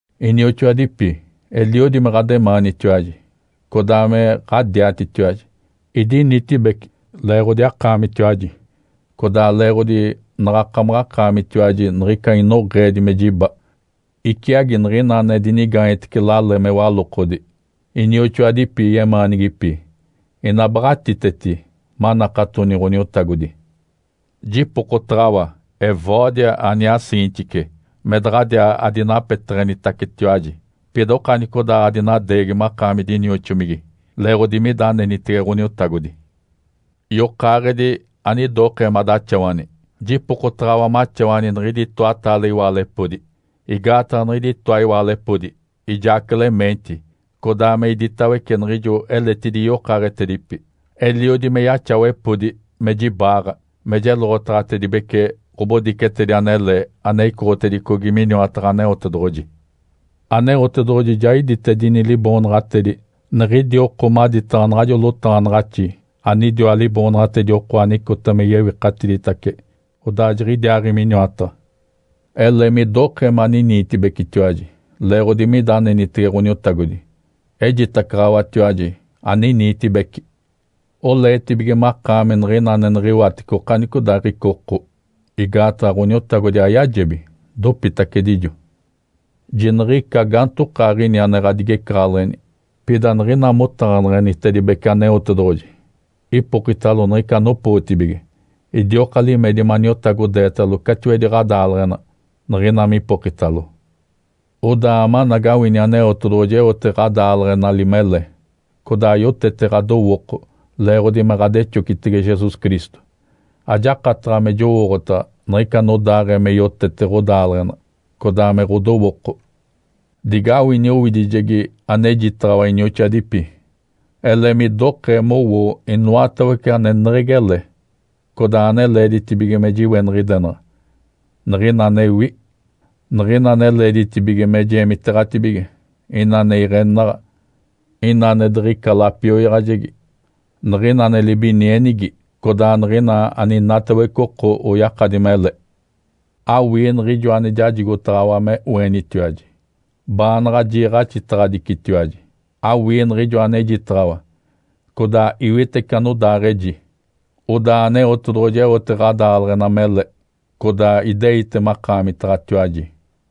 Inioxoadipi, eliodi me ɡ̶ademaanitiwaji, codaa me ɡ̶adiatitiwaji. Idinitibeci leeɡ̶odi akaamitiwaji, codaa leeɡ̶odi naɡ̶akamaɡ̶akaamitiwaji niɡ̶ica inoɡ̶eedi me jiba, iciagi niɡ̶ina ane dinigaanyetece lale me walokodi. Inioxoadipi yemaanigipi ina baɡ̶atiteti manakatoni Ǥoniotagodi. Jipokotaɡ̶awa Evódia aniaa Síntique me daɡ̶adiaa adinapeteɡ̶enitacetiwaji, pida okanicodaaɡ̶adinadeegi makaami dinioxomigi leeɡ̶odi mida anenitege Ǥoniotagodi. Yokaaɡ̶edi, anidokee madaxawani, jipokotaɡ̶awa maxawani niɡ̶idi itoataale iwaalepodi. Igaataɡ̶a niɡ̶idi itoa iwaalepodi, ijaa Clemente, codaa me iditawece niɡ̶ijo eletidi yokaaɡ̶etedipi, eliodi me yaxawepodi me jibaaɡ̶a, me jeloɡ̶otaɡ̶atedibece ɡ̶obodicetedi anele ane icoɡ̶otedicogi miniwataɡ̶a Aneotedoɡ̶oji. Aneotedoɡ̶oji ja iditedini liboonaɡ̶atedi niɡ̶idi oko maditaɡ̶a naɡ̶ajo notaɡ̶anaɡ̶axi anidiwa liboonaɡ̶atedi oko anicota me yewikatiditace odaa jiɡ̶idiaaɡ̶i miniwataɡ̶a. Ele midokee maniniitibecitiwaji leeɡ̶odi mida anenitege Ǥoniotagodi. Ejitacaɡ̶awatiwaji, aniniitibeci! Oleetibige makaami niɡ̶ina ane niɡ̶iwatece okanicodaaɡ̶ica oko. Igaataɡ̶a Ǥoniotagodi ayajebi, dopitacedijo. Jiniɡ̶ica gaantokaaɡ̶ini ane ɡ̶adigecaɡ̶aleɡ̶eni! Pida niɡ̶ina motaɡ̶aneɡ̶enitedibece Aneotedoɡ̶oji, ipokitalo niɡ̶ica anopootibige. Idioka limedi maniotagodeetalo catiwedi ɡ̶adaaleɡ̶ena, niɡ̶ina mipokitalo. Odaa amanagawini, Aneotedoɡ̶oji eote ɡ̶adaaleɡ̶enali mele, codaa yotete ɡ̶adowooko leeɡ̶odi me ɡ̶adexocitege Jesus Cristo. Ajakataɡ̶a me jowooɡ̶otaɡ̶a niɡ̶ica anodaaɡ̶ee me yotete ɡ̶odaaleɡ̶ena, codaa me ɡ̶odowooko. Digawini owidijegi anejitaɡ̶awa inioxoadipi. Ele midokee mowoo inoatawece aneneɡ̶egi ele, codaa ane leeditibige me jiweniɡ̶idenaɡ̶a, niɡ̶ina anewi, niɡ̶ina ane leeditibige me jeemiteeɡ̶atibige, ina ane iɡ̶enaɡ̶a, ina ane diɡ̶ica lapioyaɡ̶ajegi, niɡ̶ina ane libinienigi, codaa niɡ̶ina aninatawece oko oyakadi mele. Awii niɡ̶ijo ane jajigotaɡ̶awa me oenitiwaji, baanaɡ̶a jiiɡ̶axitaɡ̶adicitiwaji. Awii niɡ̶ijo anejitaɡ̶awa, codaa iwitece anodaaɡ̶eji. Odaa Aneotedoɡ̶oji eote ɡ̶adaaleɡ̶ena mele, codaa ideite makaamitaɡ̶atiwaji.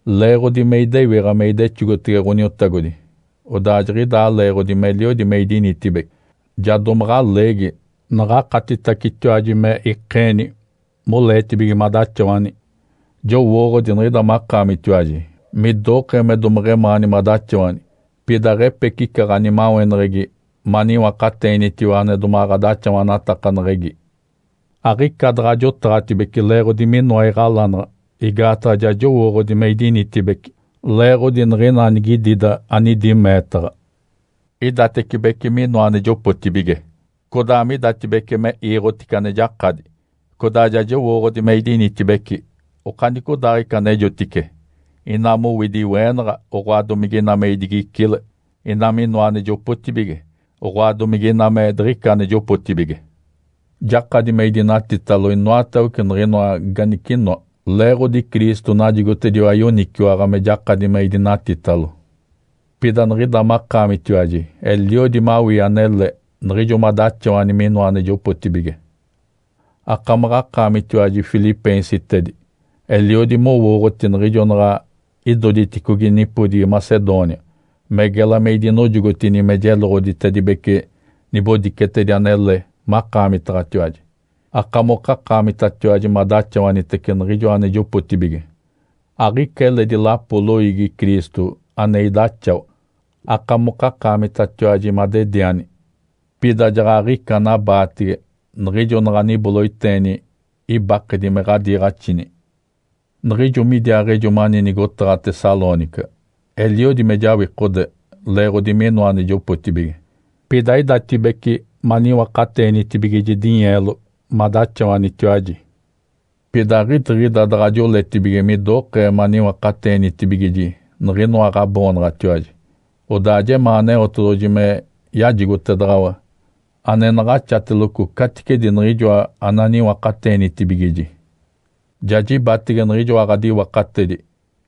Leeɡ̶odi me idewiɡ̶a me idexogotege Ǥoniotagodi, odaa jiɡ̶idaa leeɡ̶odi meliodi me idinitibeci, ja domaɡ̶a leegi, naɡ̶akatitacetiwaji me ikeeni moleetibige madaxawani. Jowooɡ̶odi niɡ̶ida makaamitiwaji midokee me domeɡ̶emaani madaxawani, pida aɡ̶epecica ɡ̶animaweneɡ̶egi maniwakateenitiwa ane ɡ̶adaxawanatakaneɡ̶egi. Aɡ̶ica daɡ̶a jotaɡ̶atibece leeɡ̶odi minoa iɡ̶alanaɡ̶a. Igaataɡ̶a ja jowooɡ̶odi me idinitibeci leeɡ̶odi niɡ̶ina anigidida anidi meetaɡ̶a. Idatecibece minoa ane jopotibige, codaa midatibece me iiɡ̶otice ane jakadi. Codaa ja jowooɡ̶odi me idinitibeci okanicodaaɡ̶ica anejotice, ina mowidi iweenaɡ̶a, oɡ̶oa, domige ina me idigicile; ina me inoa ane jopotibige, oɡ̶oa, domige ina me diɡ̶ica ane jopotibige. Jakadi me idinatitalo inoatawece niɡ̶inoa ganicinoa, leeɡ̶odi Cristo najigotediwa yoniciwaɡ̶a me jakadi me idinatitalo. Pida niɡ̶ida makaamitiwaji eliodi mawii anele niɡ̶ijo madaxawani minoa ane jopotibige. Akamaɡ̶akaamitiwaji, filipeensitedi, eliodi mowooɡ̶oti niɡ̶ijo naɡ̶a idoditicogi nipodigi Macedônia, me gela me idinojogotini me jeloɡ̶oditedibece nibodicetedi anele makaamitaɡ̶atiwaji, akamokakaamitatiwaji madaxawanitece niɡ̶ijoa ane jopotibige. Aɡ̶ica eledi lapo loiigi Cristo ane idaxawa. Akamokakaamitatiwaji madediani, pida jaɡ̶aɡ̶ica anabaatege niɡ̶ijo naɡ̶aniboloiteeni ibakedi me ɡ̶adiiɡ̶axini. Niɡ̶ijo me idiaaɡ̶ejo mani nigotaɡ̶a Tessalônica, eliodi me jawikode leeɡ̶odi minoa ane jopotibige. Pida idatibece maniwakateenitibigiji dinyeelo madaxawanitiwaji. Pida aɡ̶idiɡ̶ida daɡ̶a joletibige midokee maniwakateenitibigiji niɡ̶inoa ɡ̶aboonaɡ̶atiwaji. Odaa jemaa Aneotedoɡ̶oji me yajigotedaɡ̶awa ane naɡ̶axateloco caticedi niɡ̶ijoa ananiwakateenitibigiji. Ja jibatege niɡ̶ijoa ɡ̶adiwakatedi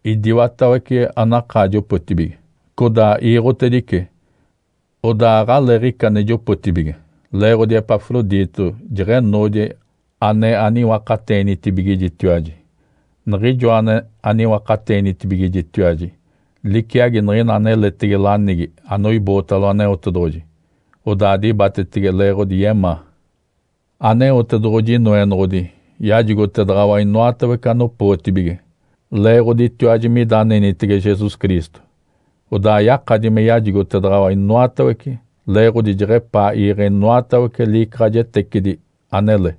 idiwatawece anakaa jopotibige, codaa iiɡ̶otedice. Odaa aɡ̶aleeɡ̶ica ane jopotibige, leeɡ̶odi Epafrodito jeɡ̶enoodi ane aniwakateenitibigijitiwaji. Niɡ̶ijoa ane aniwakateenitibigijitiwaji liciagi niɡ̶ina aneletege lanigi anoibootalo Aneotedoɡ̶oji, odaa dibatetege leeɡ̶odi yemaa. Aneotedoɡ̶oji Inoenoɡ̶odi yajigotedaɡ̶awa inoatawece anopootibige leeɡ̶oditiwaji mida anenitege Jesus Cristo. Odaa yakadi me yajigotedaɡ̶awa inoatawece, leeɡ̶odi jeɡ̶epaa iiɡ̶e inoatawece liicaɡ̶ajetecidi anele.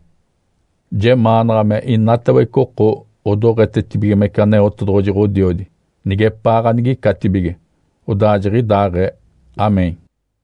Jemaanaɡ̶a me inatawece oko odoɡ̶etetibigimece Aneotedoɡ̶oji Ǥodiodi nigepaa ganigicatibige. Odaa jiɡ̶idaaɡ̶ee. (Amém.)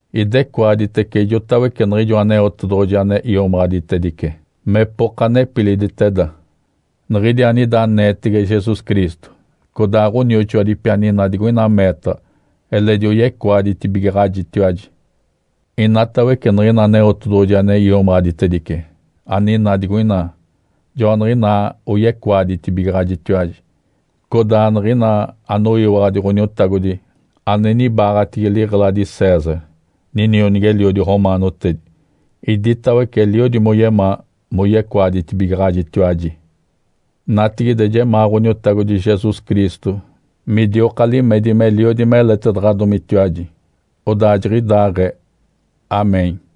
Idecoaditece ijotawece niɡ̶ijo Aneotedoɡ̶oji ane iomaɡ̶aditedice mepoka nepiliditeda, niɡ̶idi anida aneetege Jesus Cristo. Codaa ɡ̶onioxoadipi aninaa digoina meetaɡ̶a eledi oyecoaditibigaɡ̶ajitiwaji. Inatawece niɡ̶ina Aneotedoɡ̶oji ane iomaɡ̶aditedice, aninaa digoina, joaniɡ̶inaa oyecoaditibigaɡ̶ajitiwaji, codaa niɡ̶ina anoyiwaɡ̶adi Ǥoniotagodi ane nibaaɡ̶atigi liɡ̶eladi César, ninionigi-eliodi romaanotedi, iditawece eliodi moyemaa moyecoaditibigaɡ̶ajitiwaji. Natigide jemaa Ǥoniotagodi Jesus Cristo midioka limedi meliodi meletedaɡ̶adomitiwaji. Odaa jiɡ̶idaaɡ̶ee. (Amém.)